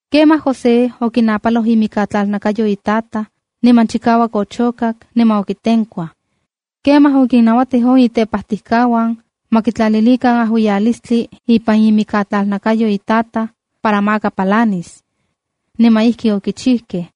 Kemaj José okinapaloj imikatlalnakayo itataj niman chikauak ochokak niman okitenkuaj. Kemaj okinnauatij on itepajtijkauan ma kitlalilikan ajuiyalistli ipan imikatlalnakayo itataj para maka palanis. Niman ijki okichijkej.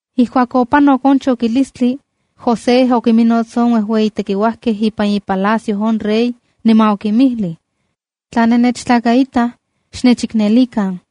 Ijkuak opanok on chokilistli, José okiminnots on uejueyi tekiuajkej ipan ipalacio on rey niman okinmijlij: —Tla nennechtlakaitaj, xnechiknelikan.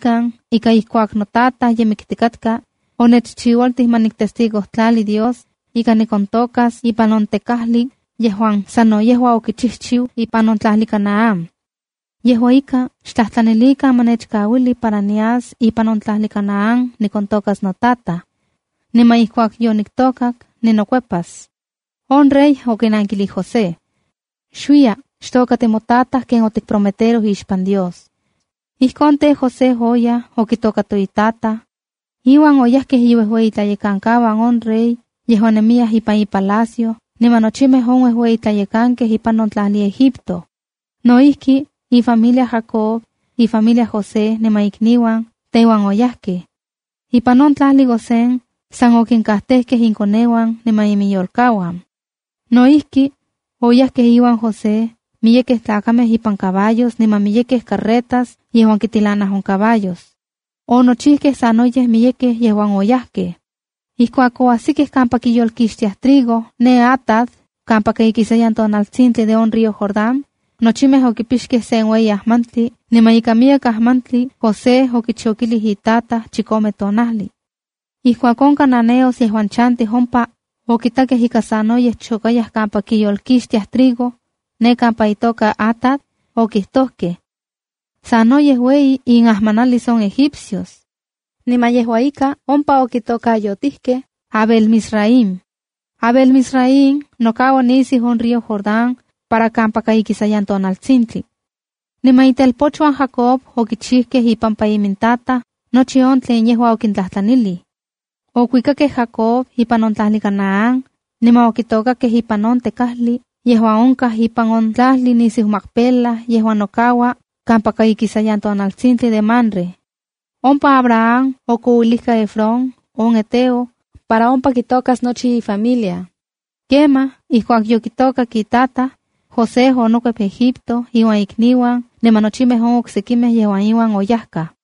ika ijkuak notataj ye miktikatka, onechchiualtij ma niktestigojtlali Dios ika nikontokas ipan on tekajli yejuan sano yejua okichijchiu ipan on tlajli Canaán. Yejua ika, xtlajtlanilikan ma nechkauili para nias ipan on tlajli Canaán nikontokas notataj. Niman ijkuak yoniktokak, ninokuepas. On rey okinankilij José: —Xuiya, xtokati motataj ken otikprometeroj ixpan Dios. Ijkon tej, José oyaj okitato itataj. Iuan oyajkej iuejueyitlayekankauan on rey yejuan nemiyaj ipan ipalacio niman nochimej on uejueyitlayekankej ipan on tlajli Egipto. No ijki, ifamilia Jacob, ifamiliaj José niman ikniuan teuan oyajkej. Ipan on tlajli Gosén, san okinkajtejkej inkoneuan niman iminyolkauan. No ijki, oyajkej iuan José miyekej tlakamej ipan caballos niman miyekej carretas yejuan kitilanaj on caballos. Onochijkej sanoyej miyekej yejuan oyajkej. Ijkuak oajsikej kampa kiyolkixtiaj trigo ne Atad kampaka ikisayan tonaltsintli de on río Jordán, nochimej okipixkej sen ueyi ajmantli niman ika miyek ajmantli José okichokilij itataj chikome tonajli. Ijkuak on cananeos yejuan chantij ompa okitakej ika sanoyej chokayaj kampa kiyolkixtiaj trigo ne kampa itoka Atad, okijtojkej: “Sanoyej ueyi inajmanalis on egipcios.” Niman yejua ika ompa okitokayotijkej Abel-mizraima. Abel-mizraim nokaua nisiu on río Jordán para kampaka ikisayan tonaltsintli. Niman itelpochuan Jacob okichijkej ipampa imintataj nochi on tlen yejua okintlajtlanilij. Okuikakej Jacob ipan on tlajli Canaán niman okitokakej ipan on tekajli yejuan onkaj ipan on tlajli nisiu Macpela yejuan nokaua kampaka ikisayan tonaltsintli de Mamre. Ompa Abraham okouilijka Efrón, on heteo, para ompa kitokas nochi ifamilia. Kemaj, ijkuak yokitokak itataj, José onokuep Egipto iuan ikniuan niman nochimej on sekimej yejuan iuan oyajkaj.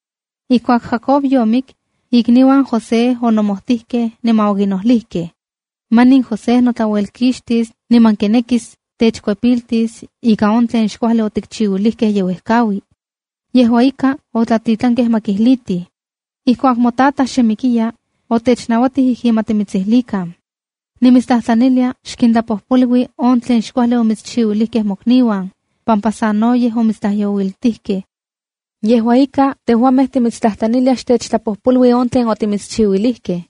Ijkuak Jacob yomik, ikniuan José onomojtikej niman okinojlijkej: “Manin José notlauelkixtis niman kinekis techkuepiltis ika on tlen xkuajli otikchiuilijkej ye uejkaui.” Yejua ika, otlatitlankej ma kijlitij: “Ijkuak motataj xe mikiya, otechnauatij ijkin ma timitsijlikan: ‘Nimitstlajtlanilia xkintlapojpolui on tlen xkuajli omitschiuilijkej mokniuan pampa sanoyej omitstlajyouiltijkej.’ Yejua ika, tejuamej timitstlajtlaniliaj xtechtlapojpolui on tlen otimitschiuilijkej.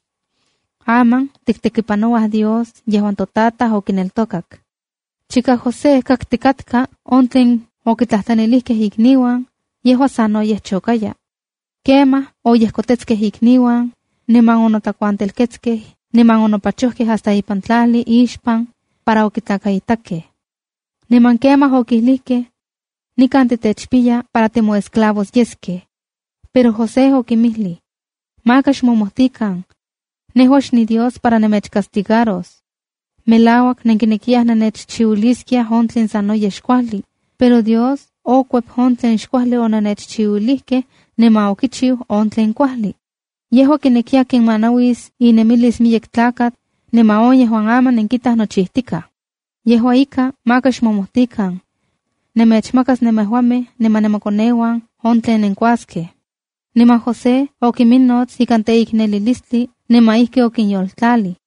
Aman tiktekipanouaj Dios yejuan totataj okineltokak.” Chika José kaktikatka on tlen okititlanilijkej ikniuan, yejua sanoyej chokaya. Kemaj oyejkotetskej ikniuan, niman onotlakuantelketskej niman onopachojkej hasta ipan tlaljli ixpan, para okitlakaitakej. Niman kemaj okilijkej: —Nikan titechpiya para timoesclavos yeskej. Pero José okinmijlij: —Maka xmomojtikan. Nejua xniDios para nemechcastigaros. Melauak nenkinekiyaj nennechchiuiliskiaj on tlen sanoyej xkuajli, pero Dios okuep on tlen xkuajli onennechchiuilijkej niman okichiu on tlen kuajli. Yejua kinekiya kinmanauis inemilis miyek tlakatl, niman on yejua yejuan aman nenkitaj nochijtikaj. Yejua ika, maka xmomojtikan. Nemechmakas nemejuamej niman nemokoneuan on tlen nenkuaskej. Niman José okinminots ikan teiknelilistli niman ijki okinyoltlalij.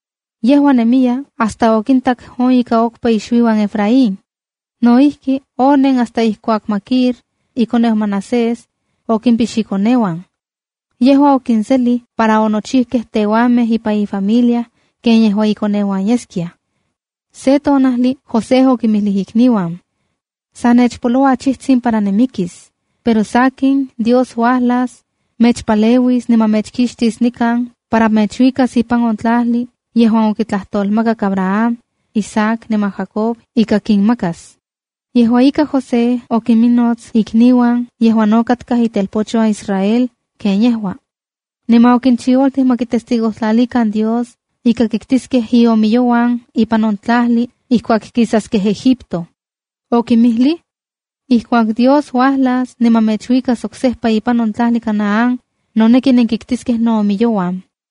Yejua nemiya hasta okintak on ika okpa ixuiuan Efraín. No ijki, onen hasta ijkuak Maquir, ikoneu Manasés, okimpix ikoneuan. Yejua okinselij para onochijkej teuanmej ipan ifamilia ken yejua ikoneuan yeskiaj. Se tonajli José okinmijlij ikniuan: “Sa nechpoloua achijtsin para nimikis, pero sakin, Dios uajlas, mechpaleuis niman mechkixtis nikan para mechuikas ipan on tlajli yejuan okitlajtolmakak Abraham, Isaac niman Jacob ika kinmakas.” Yejua ika, José okinminots ikniuan yejuan no katkaj itelpochuan Israel ken yejua. Niman okinchiualtij ma kitestigojtlalikan Dios ika kiktiskej iomiyouan ipan on tonajli ijkuak kisaskej Egipto. Okimijlij: “Ijkuak Dios uajlas niman mechuikas oksejpa ipan on tlajli Canaán, noneki nenkiktiskej noomiyouan.”